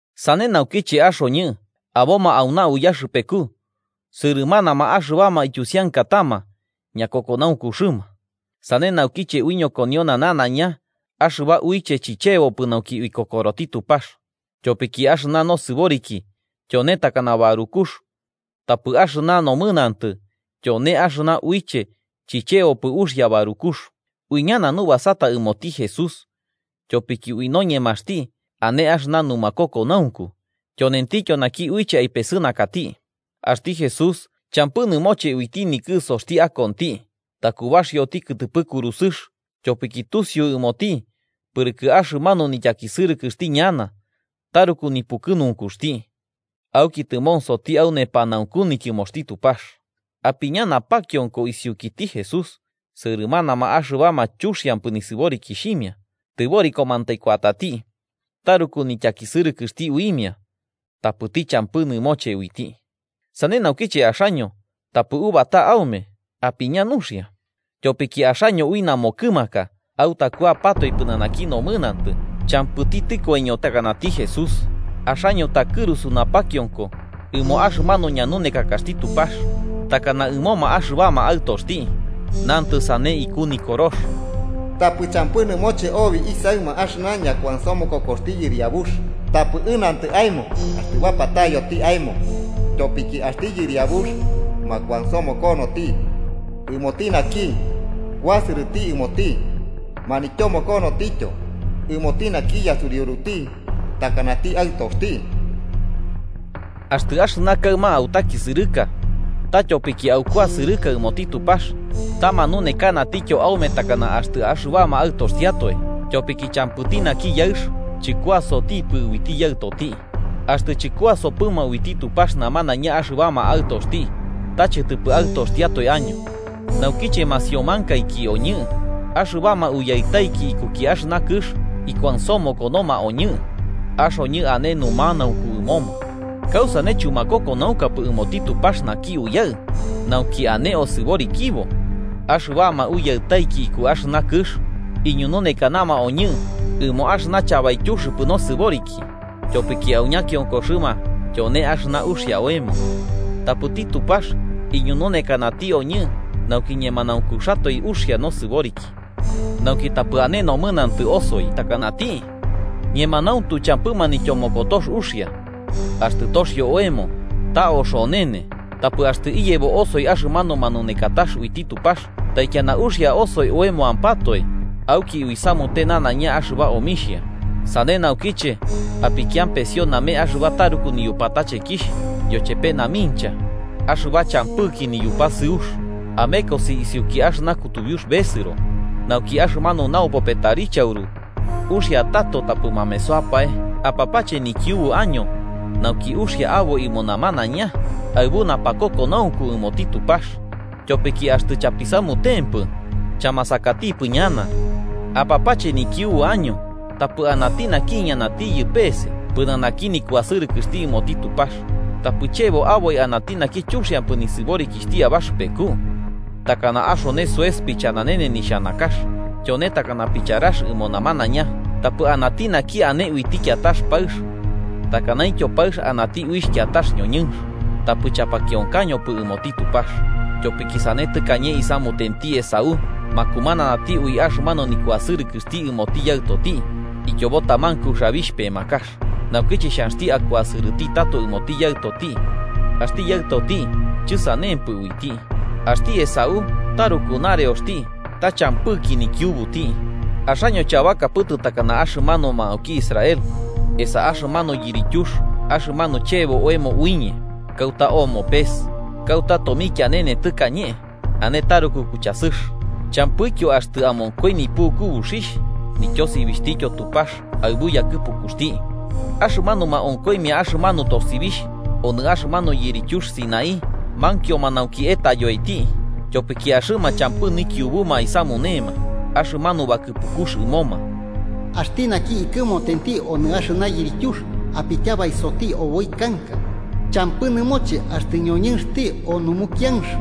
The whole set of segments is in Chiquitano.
Sane naukiche, axoñɨ aboma auna uyaxɨpeku sɨrɨmanama axɨbama ityusiankatama ñakokonaunkuxɨma, sane naukiche uiñokoniona nanaiña axɨba uiche chichebopɨ nauki uikokoroti Tupax. Tyopiki axɨna nosɨboriki tyone takana barukux, tapɨ axɨna nomɨnantɨ tyone axɨna uiche chichebopɨ uxia barukux. Uiñana nubasata ɨmoti Jesús, tyopiki ui noñemaxti ane axɨna numakokonaunku, tyonentityo naki uiche aipesɨnakati. Axti Jesús champɨ nɨmoche uiti nikɨsoxti akonti takubaxioti kɨtɨpɨ kurusɨx, tyopiki tusiu ɨmoti pɨrɨkɨ axɨmanu nityakisɨrɨkɨxti ñana taruku nipukɨnunkuxti. Auki tɨmonsoti au nepanaunku nityɨmoxti Tupax. Apiña napakionko isiukiti Jesús, sɨrɨmanama axɨbama chuxiampɨ nisɨborikixhimia tɨborikomantai kuatati taruku nityakisɨrɨkɨxti uimia, tapɨti champɨ nɨmoche uiti. Sane naukiche axaño tapɨ ubata aume, apiña nuxia. Tyopiki axaño ui namokɨmaka autakuapatoe pɨnanaki nomɨnantɨ, champɨti tɨkoiño takanati Jesús. Axaño takɨrusu napakionko ɨmo axɨmanu ñanunekakaxti Tupax takana ɨmoma axɨbama aɨtoxti. Nantɨ sane iku Nikorox: “Tapɨ champɨ nɨmoche obi isaɨma, axɨna ñakuansomokokoxti Yɨriabux, tapɨ ɨnantɨ aemo axtɨ bapatayoti aemo. Tyopiki axti Yɨriabux makuansomokonoti ɨmoti naki kuasɨrɨti ɨmoti, manityomokonotityo ɨmoti naki yasuriuruti takanati aɨtoxti.” Axtɨ axɨna kaɨma autakisɨrɨka, ta tyopiki aukuasɨrɨka ɨmoti Tupax ta manunekanatityo aume takana axtɨ axɨbama aɨtoxtiatoe. Tyopiki champɨti naki yaɨx chɨkuasotipɨ uiti yaɨtoti. Axtɨ chɨkuasopɨma uiti Tupax namanaiña axɨbama aɨtoxti, ta chɨtɨpɨ aɨtoxtiatoe año. Naukiche masiomankaiki oñɨ, axɨbama uyaɨtaiki ikuki axɨna kɨx ikuansomokonoma oñɨ, axoñɨ ane numanaunku ɨmoma. ¿Kausane chumakokonaunkapɨ ɨmoti Tupax naki Uyaɨ nauki ane osɨborikibo? Axɨbama uyaɨtaiki iku axɨna kɨx iñununekanama oñɨ ɨmo axɨna chabaityuxɨpɨ nosɨboriki, tyopiki au ñakionkoxɨma tyone axɨna uxia oemo. Tapɨti Tupax iñununekanati oñɨ nauki ñemanaunkuxatoe uxia nosɨboriki, nauki tapɨ ane nomɨnantɨ osoi takanati. Ñemanauntu, champɨ manityomokotox uxia axtɨ toxio oemo. Ta oxonene. Tapɨ axtɨ iyebo osoi axɨmanu manunekatax uiti Tupax, taikiana uxia osoi oemoampatoe auki uisamute nanaiña axɨba omixhia. Sane naukiche, apikiampesio name axɨba taruku niyupatachekixh yochepe namincha axɨba champɨki niyupasɨux, amekosi isiuki axɨna kutubiux besɨro, nauki axɨmanu naupope tarichauru uxia tato tapɨ mamesoapae. Apapache nikiubu año nauki uxia aboi ɨmo namanaiña aɨbu napakokonaunku ɨmoti Tupax, tyopiki axtɨ chapisamutempɨ, chamasakatipɨ ñana. Apapache nikiubu año tapɨ anati naki iñanatiyɨ pese pɨnanaki nikuasɨrɨkɨxti ɨmoti Tupax. Tapɨ chebo aboi anati naki chuxiampɨ nisɨborikixhti abaxɨpeku takana axone soes pichananene nixhanakax tyone takana picharax ɨmo namanaiña. Tapɨ anati naki ane uiti kiatax paɨx takanaintyo paɨx anati uixh kiatax ñoñɨnx, tapɨ chapakionkañopɨ ɨmoti Tupax. Tyopiki sane tɨkañe isamutenti Esaú, makumananati ui axɨmanu nikuasɨrɨkɨxti ɨmoti yaɨtoti ityobo taman kuxabixh pemakax. Naukiche xhanxti akuasɨrɨti tato ɨmoti yaɨtoti, axti yaɨtoti chɨsanempɨ uiti. Axti Esaú taruku nareoxti ta champɨki nikiubuti. Axaño chabakapɨtɨ takana axɨmanuma auki Israel, esa axɨmanu yirityux axɨmanu chebo oemo uiñe kauta omo pes, kauta tomikianene tɨkañe, ane taruku kuchasɨx. Champɨityo axtɨ amonkoi nipuku buxixh, nityosibixhtityo Tupax aɨbu yakɨpukuxti. Axɨmanuma onkoimia axɨmanu tosibixh onɨ axɨmanu yirityux Sinaí mankioma nauki etayoiti. Tyopiki axɨma champɨ nikiubuma aisamunema axɨmanu bakɨpukux ɨmoma: “Axti naki ikɨmotenti onɨ axɨna yirityux, apityabaisoti oboi kanka, champɨ nɨmoche axtɨ ñoñɨnxti o numukianx.”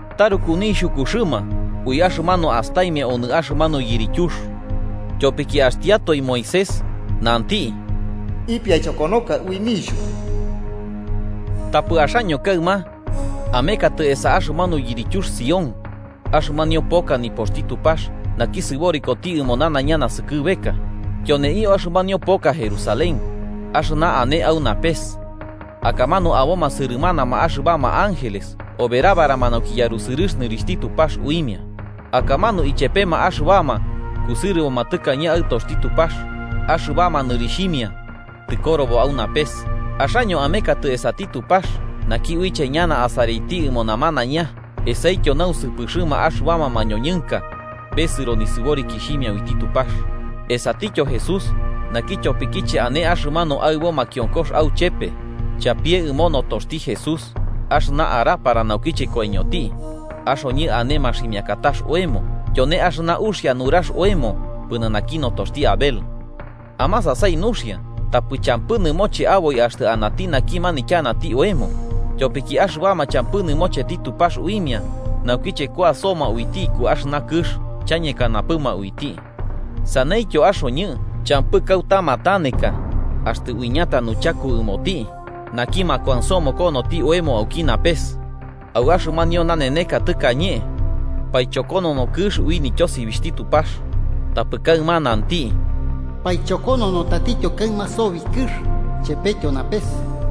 Taruku nixhukuxɨma ui axɨmanu astaimia onɨ axɨmanu yirityux. Tyopiki axtiatoe Moisés nanti: “Ipiaichokonoka ui nixhuku.” Tapɨ axaño kaɨma, amekatɨ esa axɨmanu yirityux Sión, axɨmanio poka nipoxti Tupax naki sɨborikoti ɨmo nanaiña naskɨbeka. Tyoneio axɨmanio poka Jerusalén, axɨna ane au napes. Akamanu aboma sɨrɨmanama axɨbama ángeles oberabarama nauki yarusɨrɨx nɨrixhti Tupax uimia, akamanu chepema axɨbama kusɨrɨboma tɨkañe aɨtoxti Tupax axɨbama nɨrixhimia tɨkorobo au napes. Axaño amekatɨ esati Tupax, naki uiche ñana asaraiti ɨmo namanaiña, esaityo nausɨpɨxɨma axɨbama mañoñɨnka besɨro nisɨborikixhimia uiti Tupax, esatityo Jesús, naki tyopikiche ane axɨmanu aɨbo makionkox auchepe. Chapie ɨmo notoxti Jesús axɨna arapara naukiche koiñoti, axoñɨ ane maximiakatax oemo, tyone axɨna uxia nurax oemo pɨnanaki notoxti Abel. Amasasai nuxia, tapɨ champɨ nɨmoche aboi axtɨ anati naki manityanati oemo. Tyopiki axɨbama champɨ nɨmocheti Tupax uimia naukiche kuasoma uiti iku axɨna kɨx, chañekanapɨma uiti. Saneityo axoñɨ champɨ kauta mataneka axtɨ uicheta nuchaku ɨmoti naki makuansomokonoti oemo auki napes. Au axɨmanio naneneka tɨkañe, paichokonono kɨx ui nityosibixhti Tupax, tapɨ kaɨma nanti: “Paichokonono tatityo kaɨma sobi kɨx chepetyo napes.”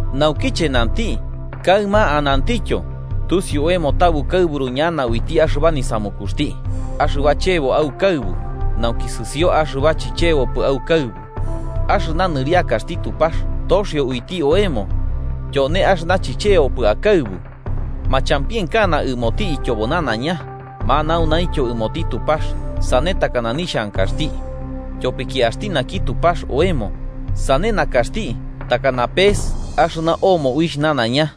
Naukiche nanti “Kaɨma anantityo”, tusiu oemo ta bukaɨburu ñana uiti axɨba nisamukuxti, axɨba chebo aukaɨbu, nauki sɨsio axɨba chichebopɨ aukaɨbu. Axɨna nɨriakaxti Tupax toxio uiti oemo, tyone axɨna chichebopɨ akaɨbu. Machampienkana ɨmoti ityobo nanaiña, manaunaintyo ɨmoti Tupax sane takana nixhankaxti. Tyopiki axti naki Tupax oemo, sane nakaxti takana pese axɨna omo uixh nanaiña.